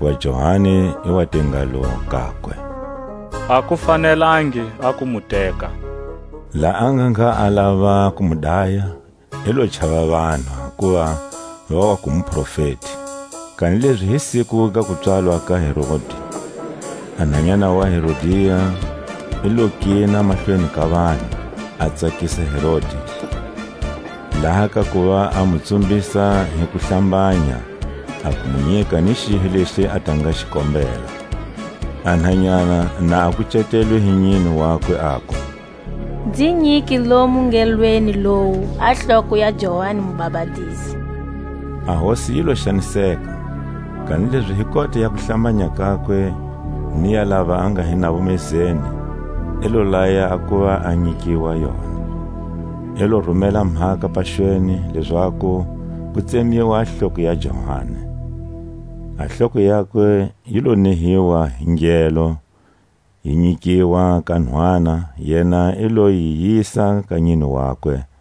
Hakuva Johani i wa te ngalo kakwe: A ku fanelangi a ku mu teka. Laha a nga ngha a lava ku mu daya, i lo chava vanhu, hakuva va waku muprofeti. Kanilezi hi siku ga kupswalwa ka Herodi, a nhanyana wa Herodia i lo kina mahlweni ka vanhu, a tsakisa Herodi, laha kakuva a mu tsumbisa hi kuhlambanya a ku mu nyika ni xihi lexi a ta nga xi kombela. A nhanyana na a kucetelwe hi nyine wakwe, aku: Nzi nyike lomu ngelweni lowu a hloko ya Johani Mubapatizi. A hosi yi lo xaniseka, kanilezi hi kota ya kuhlambanya kakwe ni ya lava a nga hi navo mezeni, i lo laya a kuva a nyikiwa yona. I lo rumela mhaka paxweni, lezaku ku tsemiwa a hloko ya Johani. A hloko yakwe yi lo nehiwa hi ngelo, yi nyikiwa ka nhwana; yena i lo yi yisa ka nyine wakwe.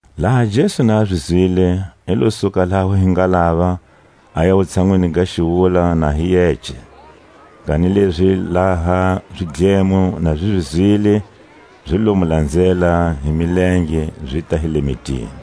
Laha Jesu na zi zwile, i lo suka laho hi ngalava, aya wutshanwini ga xiwula na hi yece. Kanilezi laha zidlemo na zi zwile, zi lo mu lanzela hi milenge zita hi le mitini.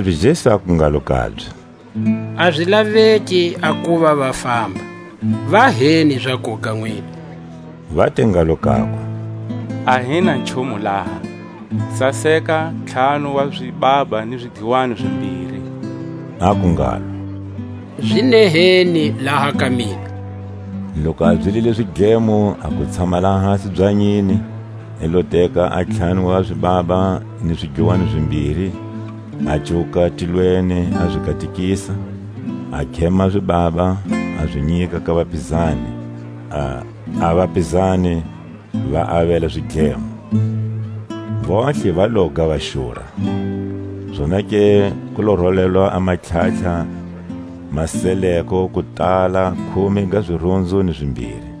Kanilezi Jesu aku ngalo kabye: A zi laveki a kuva va famba, va heni zakuga nwina. Va te ngalo kakwe: A hi na nchumu laha, saseka ntlhanu wa zibaba ni zidluwani zimbiri. Aku ngalo; Zi neheni laha ka mina. Loku a byelile zidlemo a ku tshama lahasi byanyini, i lo teka a ntlhanu wa zibaba ni zidluwani zimbiri, a cuwuka tilweni a zi katekisa, a khema zibaba a zi nyika ka vapizani, a vapizani va avela zidlemo. Vontlhe va loga va xura. Zonake ku lo rolelwa a matlhatlha ma seleko, ku tala khume ga zirunzu ni zimbiri.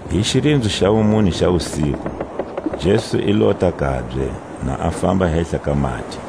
Hi xirinzo xa wumune xa wusiku Jesu i lota kabye, na a famba hehla ka mati.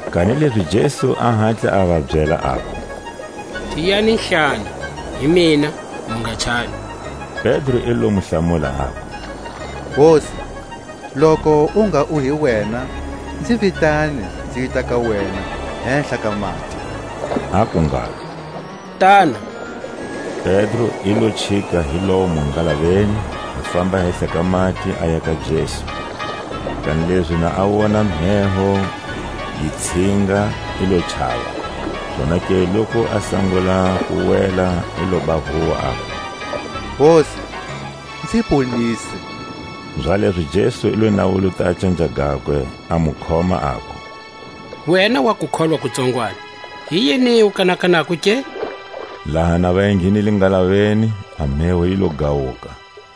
Kanilezi Jesu a hatla a va byela, aku: Tiyani-hlana, hi mina; mu nga chavi. Pedro i le mu hlamula, aku: Hosi, loku u ngha u hi wena, nzi vitane nzita ka wena hehla ka mati. Aku ngalo: Tana. Pedro i lo chika hi lomo ngalaveni, a famba hehla ka mati, aya ka Jesu. Kanilezi pa a wona mheho yi tshinga, i lo chava; zonake loku a sangula ku wela i loba huwa, aku: Hosi, nzi ponise. Zalezo Jesu i lo nawuluta a canja gakwe, a mu khoma, aku: Wena wa, kukholwa ku tsongwani, hi yini u kanakanako ke? Laha na va enghenile ngalaveni a mheho yi lo gawuka.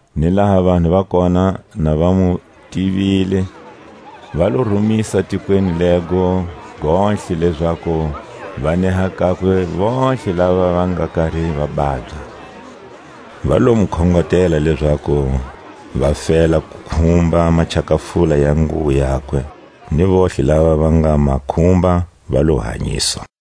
Ni laha vanhu va kona na va mu tivile, va lo rumisa tikweni lego gontlhe, lezaku va neha kakwe vontlhe lava va nga kari va babya. Va lo mu khongotela lezaku va fela ku khumba machakafula ya nguwo yakwe, ni vontlhe lava va nga ma khumba va lo hanyiswa.